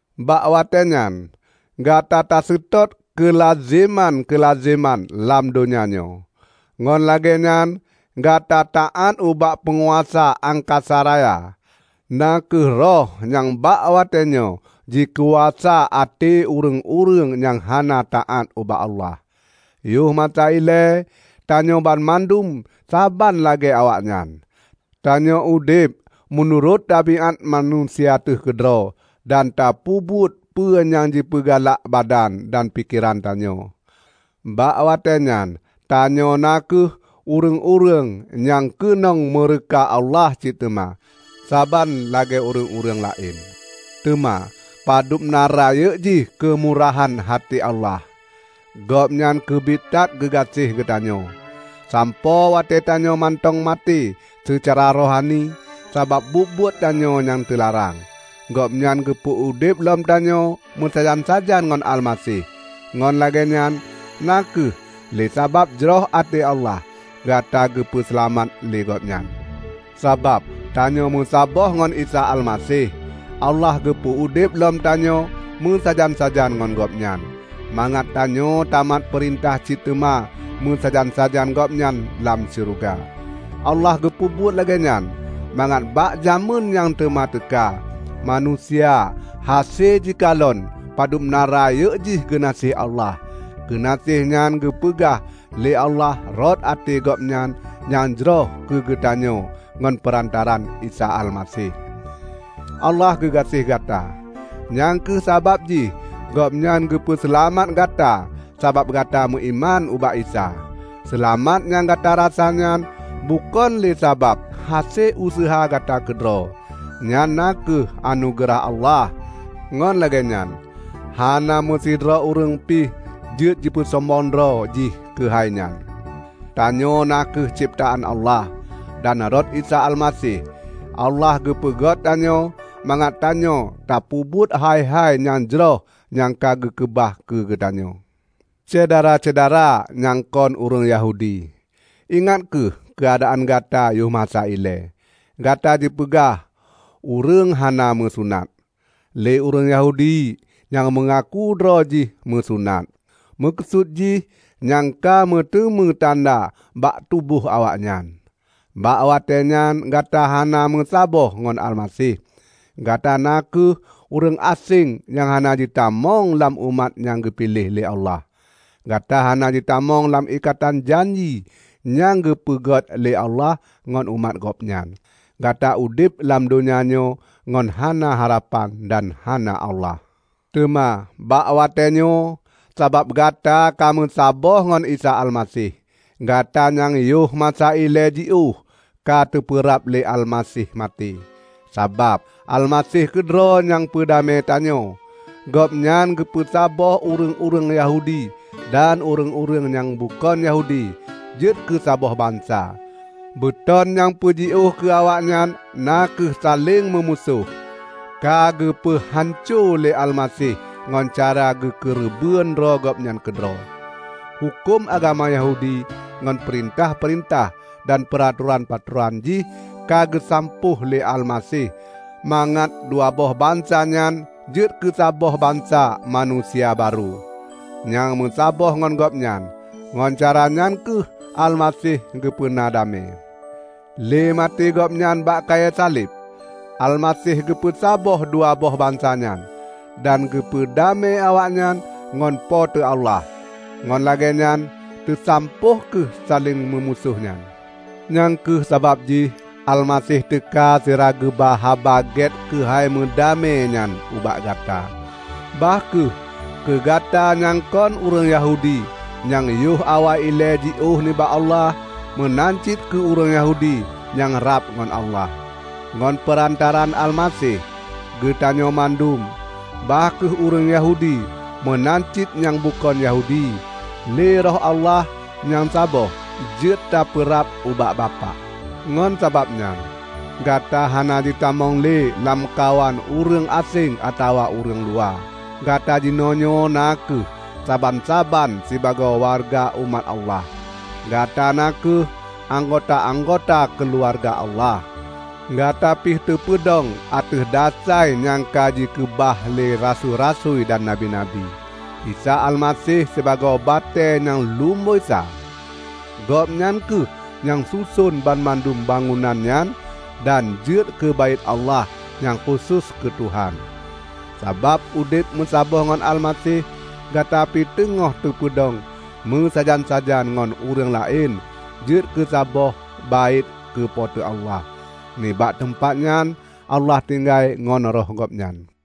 Bak watée nyan gata taseutôt keulazeman-keulazeman lam donya nyoe; ngon lagée nyan gata taát ubak peunguasa angkasa raya, na kheueh roh nyang bak watée nyoe jikuasa até ureuëng-ureuëng nyang hana taát ubak Allah. Yoh masa ilée tanyoe banmandum saban lagée awaknyan; tanyoe udeb meunurot tabiát manusia teuh keudroe dan tapeubuet peue nyang jipeugalak badan dan pikeran tanyoe. Bak watée nyan tanyoe na kheueh ureuëng-ureuëng nyang keunong meureuka Allah cit teuma, saban lagée ureuëng-ureuëng laén. Teuma padubna rayeuk jih keumurahan até Allah! Gobnyan keubiet that geugaséh geutanyoe, sampoe watée tanyoe mantong maté seucara rohani sabab buet-buet tanyoe nyang teularang, Gobnyan geupeu udeb lom tanyoe meusajan-sajan ngon Almaseh. Ngon lagée nyan, na kheueh lé sabab jroh até Allah, gata geupeu seulamat lé Gobnyan. Sabab tanyoe meusaboh ngon Isa Almaseh, Allah geupeu udeb lom tanyoe meusajan-sajan ngon Gobnyan, mangat tanyoe tamat peurintah cit teuma meusajan-sajan Gobnyan lam syeuruga. Allah geupeubuet lagée nyan mangat bak jamén nyang teuma teuka, manusia hase jikalon padub na rayeuk jih geunaséh Allah. Geunaséh nyan geupeugah lé Allah rot até Gobnyan nyang jroh keu geutanyoe ngon peurantaraan Isa Almaseh. Allah geugaséh gata, nyang kheueh sabab jih Gobnyan geupeu seulamat gata sabab gata meuiman ubak Isa. Seulamat nyang gata rasa nyan bukon lé sabab hase useuha gata keudroe. Nyan na kheueh anugeurah Allah. Ngon lagée nyan, hana meusidroe ureuëng pih jeuet jipeusombong droe jih keuhai nyan. Tanyoe na kheueh cebtaan Allah, dan rot Isa Almaseh, Allah geupeugét tanyoe mangat tanyoe tapeubuet hai-hai nyang jroh nyang ka geukeubah keu geutanyoe. Syedara-syedara nyang kon ureuëng Yahudi! Ingat kheueh keuadaan gata yoh masa ilée: Gata jipeugah "ureuëng hana meusunat", lé ureuëng Yahudi nyang meungaku droe jih meusunat (meukeusut jih nyang ka meuteumé tanda bak tuboh awaknyan). Bak watée nyan gata hana meusaboh ngon Almaseh, gata na kheueh ureuëng aséng nyang hana jitamong lam umat nyang geupiléh lé Allah. Gata hana jitamong lam ikatan janji nyang geupeugot lé Allah ngon umat Gobnyan. Gata udeb lam donya nyoe ngon hana harapan dan hana Allah. Teuma bak watée nyoe, sabab gata ka meusaboh ngon Isa Almaseh, gata nyang yoh masa ilée jiôh, ka teupeurab lé Almaseh maté. Sabab Almaseh keudroe nyang peudamé tanyoe. Gobnyan geupeu saboh ureuëng-ureuëng Yahudi dan ureuëng-ureuëng nyang bukon Yahudi jeuet keusaboh bansa. Beuton nyang peujiôh keu awaknyan, na kheueh saléng meumusoh, ka geupeu hanco lé Almaseh ngon cara geukeureubeuen droe Gobnyan keudroe. Huköm agama Yahudi ngon peurintah-peurintah dan peuratoran-peuratoran jih ka geusampôh lé Almaseh mangat dua boh bansa nyan jeuet keusaboh bansa manusia barô, nyang meusaboh ngon Gobnyan. Ngon caranyan kheueh Almaseh geupeuna damé. Lé maté Gobnyan bak kayée saleb, Almaseh geupeu saboh dua boh bansa nyan, dan geupeu damé awaknyan ngon Po teu Allah, ngon lagée nyan teusampôh kheueh saléng meumusoh nyan. Nyang kheueh sabab jih Almaseh teuka sira geuba Haba Gét keuhai meudamé nyan ubak gata; bah kheueh keugata nyang kon ureuëng Yahudi nyang yoh awai ilée jiôh nibak Allah, meunan cit keu ureuëng Yahudi nyang rab ngon Allah. Ngon peurantaraan Almaseh, geutanyoe mandum -- bah kheueh ureuëng Yahudi meunan cit nyang bukon Yahudi -- lé Roh Allah nyang saboh, jeuet tapeurab ubak Bapak. Ngon sabab nyan, gata hana jitamong lé lamkawan ureuëng aséng atawa ureuëng luwa. Gata jinoenyoe na kheueh saban-saban sibagoe wareuga umat Allah. Gata na kheueh anggota-anggota keuluwarga Allah. Gata pih teupeudong ateueh dasai nyang ka jikeubah lé rasui-rasui dan nabi-nabi, Isa Almaseh sibagoe batée nyang lumboi sa. Gobnyan kheueh nyang suson banmandum bangunan nyan dan jeuet keu Baét Allah nyang khusos keu Tuhan. Sabab udeb meusaboh ngon Almaseh, gata pih teungoh teupeudong meusajan-sajan ngon ureuëng laén jeuet keusaboh baét keu Po teu Allah; nibak teumpat nyan Allah tinggai ngon Roh Gobnyan.